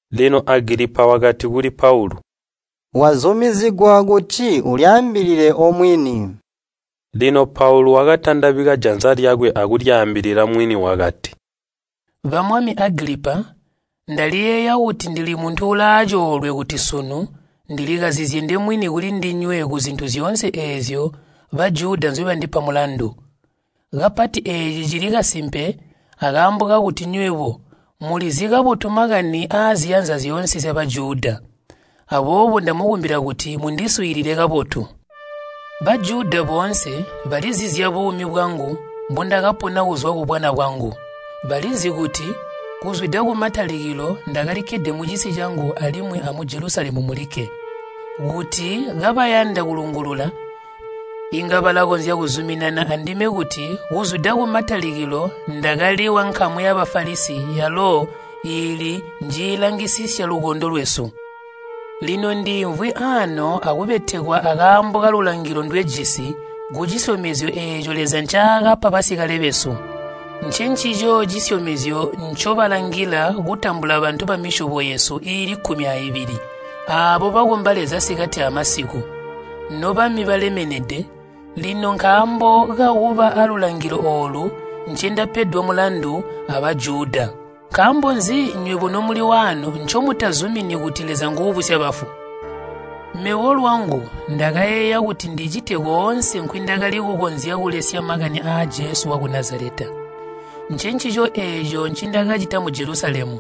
Lino Agilipa wakati kuli Paulu, “Wazumizigwa kuti ulyaambilile omwini.” Lino Paulu wakatandabika janza lyakwe akulyaambilila mwini wakati, “Ba Mwami Agilipa! Ndaliyeeya kuti ndili muntu uulaacoolwe kuti sunu ndilikazizye ndemwini kulindinywe kuzintu zyoonse eezyo Bajuda nzyobandipa mulandu. Kapati eeci cili kasimpe akaambo kakuti nywebo mulizi kabotu makani aaziyanza zyoonse zya Bajuda. Aboobo ndamukumbila kuti mundiswiilile kabotu. “Bajuda boonse balizi zyabuumi bwangu mbundakapona kuzwa kubwana bwangu. Balizi kuti kuzwida kumatalikilo ndakalikkede mucisi cangu alimwi amu Jelusalemu mulikke. Kuti kabayanda kulungulula, inga balakonzya kuzuminana andime kuti kuzwida kumatalikilo ndakali wankamu ya Bafalisi yalo iili njiilangisisya lukondo lwesu. Lino ndiimvwi aano akubetekwa akaambo kalulangilo ndwejisi kucisyomezyo eeco Leza ncaakapa basikale besu. Ncencico cisyomezyo ncobalangila kutambula bantu bamisyobo yesu iili kkumi aibili, aabo bakomba Leza sikati amasiku. Nobami balemenede, lino nkaambo kakuba alulangilo oolu, ncindapedwa mulandu a Bajuda! Nkaambo nzi nywebo nomuli waano ncomutazumini kuti Leza nguubusya bafu? “Mebo lwangu ndakayeeya kuti ndicite koonse nkwindakali kukonzya kulesya makani aa Jesu waku Nazaleta. Ncencico eeco ncindakacita mu Jelusalemu.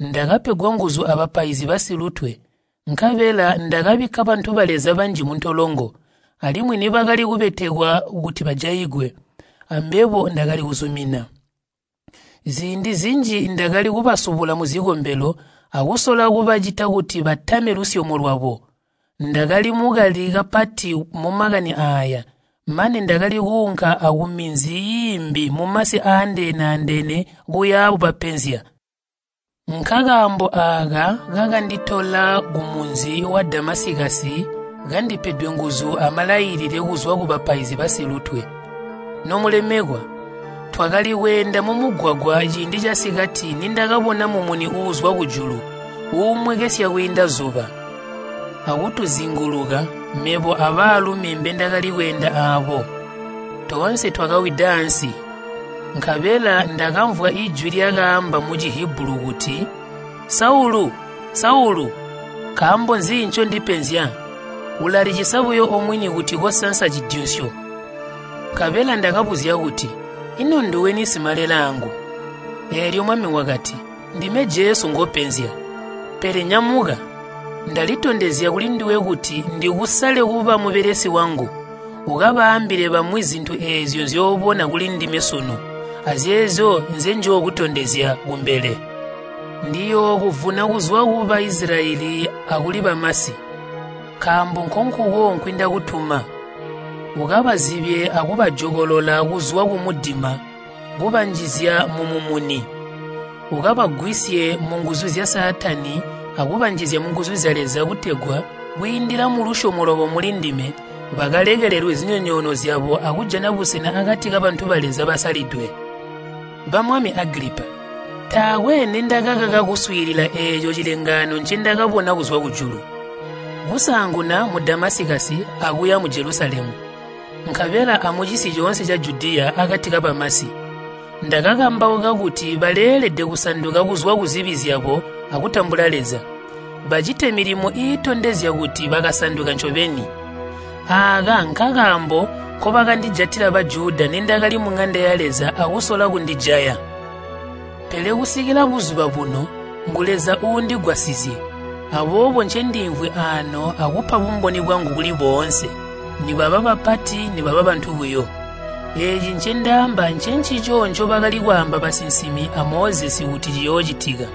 Ndakapegwa nguzu abapaizi basilutwe, nkabela ndakabikka bantu ba Leza banji muntolongo, alimwi nibakali kubetekwa kuti bajaigwe, ambebo ndakali kuzumina. Ziindi zinji ndakali kubasubula muzikombelo, akusola kubacita kuti batame lusyomo lwabo. Ndakali mukali kapati mumakani aaya, mane ndakali kuunka akuminzi iimbi mumasi aandeene-andeene kuya bubapenzya. “Nkakaambo aaka kakanditola kumunzi wa Damasikasi kandipedwe nguzu amalailile kuzwa kubapaizi basilutwe. Nomulemekwa, twakali kweenda mumugwagwa ciindi casikati nindakabona mumuni uuzwa kujulu, uumwekesya kwiinda zuba, akutuzinguluka, mebo abaalumi mbindakali kweenda aabo. Toonse twakawida aansi. Nkabela ndakamvwa jwi lyakaamba mu Cihibulu kuti, ‘Saulu, Saulu! Nkaambo nzi ncondipenzya? Ulalicisa buyo omwini kuti kosansa cidyunsyo.’ Nkabela ndakabuzya kuti, ‘Ino nduweni Simalelaangu?’ Eelyo Mwami wakati, ‘Ndime Jesu ngopenzya. Pele nyamuka! Ndalitondezya kulinduwe kuti ndikusale kuba mubelesi wangu, ukabaambile bamwi zintu eezyo nzyoobona kulindime sunu, azeezyo nzenjookutondezya kumbele. Ndiyookuvuna kuzwa ku Baisilayeli akuli bamasi, nkaambo nkonkuko nkwindakutuma. Ukabazibye akubajokolola kuzwa kumudima kubanjizya mumumuni. Ukabagwisye munguzu zya Saatani akubanjizya munguzu zya Leza kutegwa kwiindila mulusyomo lwabo mulindime bakalekelelwe zinyonyoono zyabo akujana busena akati kabantu ba Leza basalidwe.’ “Bamwami Agilipa, taakwe nindakakaka kuswiilila eeco cilengaano ncendakabona kuzwa kujulu. Kusaanguna mu Damasikasi akuya mu Jelusalemu, nkabela amucisi coonse ca Judiya akati kabamasi, ndakakambauka kuti baleelede kusanduka kuzwa kuzibi zyabo akutambula Leza. Bacite milimo iitondezya kuti bakasanduka ncobeni. Aaka nkakaambo nkobakandijatila Bajuda nindakali muŋanda ya Leza akusola kundijaya. Pele kusikila buzuba buno ngu Leza uundigwasizye, aboobo ncendiimvwi aano akupa bumboni bwangu kuli boonse, nibaba bapati nibaba bantu buyo. Eeci ncendaamba ncencico ncobakali kwaamba basinsimi a Mozesi kuti ciyoocitika,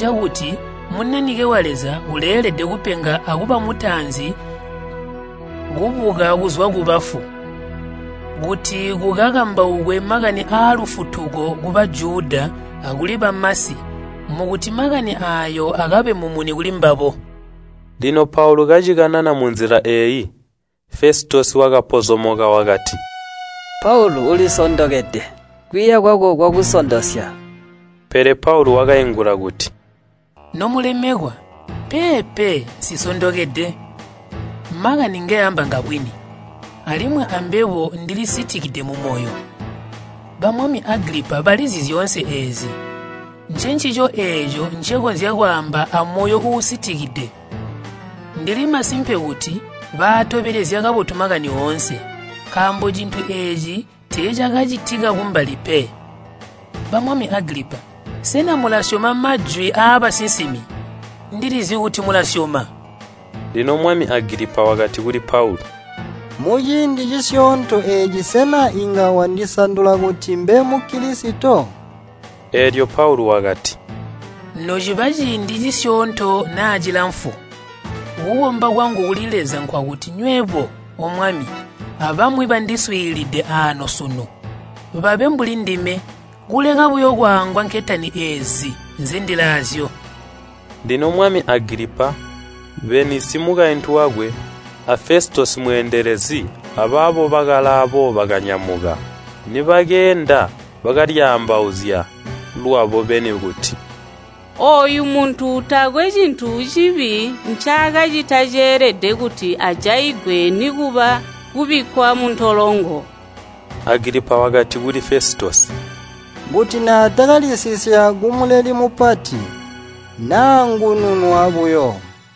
cakuti Munanike wa Leza uleelede kupenga akuba mutaanzi kubuka kuzwa kubafu, kuti kukakambaukwe makani aalufutuko ku Bajuda akuli bamasi mukuti makani aayo akabe mumuni kulimbabo.” Lino Paulu kacikanana munzila eeyi, Fesitosi wakapozomoka wakati, “Paulu ulisondokede! Kwiiya kwako kwakusondosya!” Pele Paulu wakaingula kuti, “Nomulemekwa, peepe, nsisondokede. Makani ngeamba ngabwini, alimwi ambebo ndili sitikide mumoyo. Bamwami Agilipa balizi zyoonse eezyi. Ncencico eeco ncekonzya kwaamba amoyo uusitikide. Ndili masimpe kuti baatobelezya kabotu makani oonse, nkaambo cintu eeci tiicakacitika kumbali pe. Bamwami Agilipa, sena mulasyoma majwi aabasinsimi? Ndilizi kuti mulaasyoma!” Lino mwami Agilipa wakati kuli Paulu, “Muciindi cisyoonto eeci sena inga wandisandula kuti mbe mu Kilisito?” Eelyo Paulu wakati, “Nociba ciindi cisyoonto naa cilamfu, kukomba kwangu kuli Leza nkwakuti nywebo, omwami, abamwi bandiswiilide aano sunu, babe mbulindime, kuleka buyo kwaangwa nketani eezi nzendilaazyo!” Lino mwami Agilipa, Beenisi mukaintu wakwe, a Fesitosi mweendelezi, abaabo bakalaabo bakanyamuka. Nibakeenda, bakalyaambauzya lwabo beni kuti, “Ooyu muntu taakwe cintu cibi ncaakacita ceelede kuti ajaigwe nikuba kubikkwa muntolongo.” Agilipa wakati kuli Fesitosi, “Kuti naatakalisisya ku Muleli Mupati, naangununwa buyo.”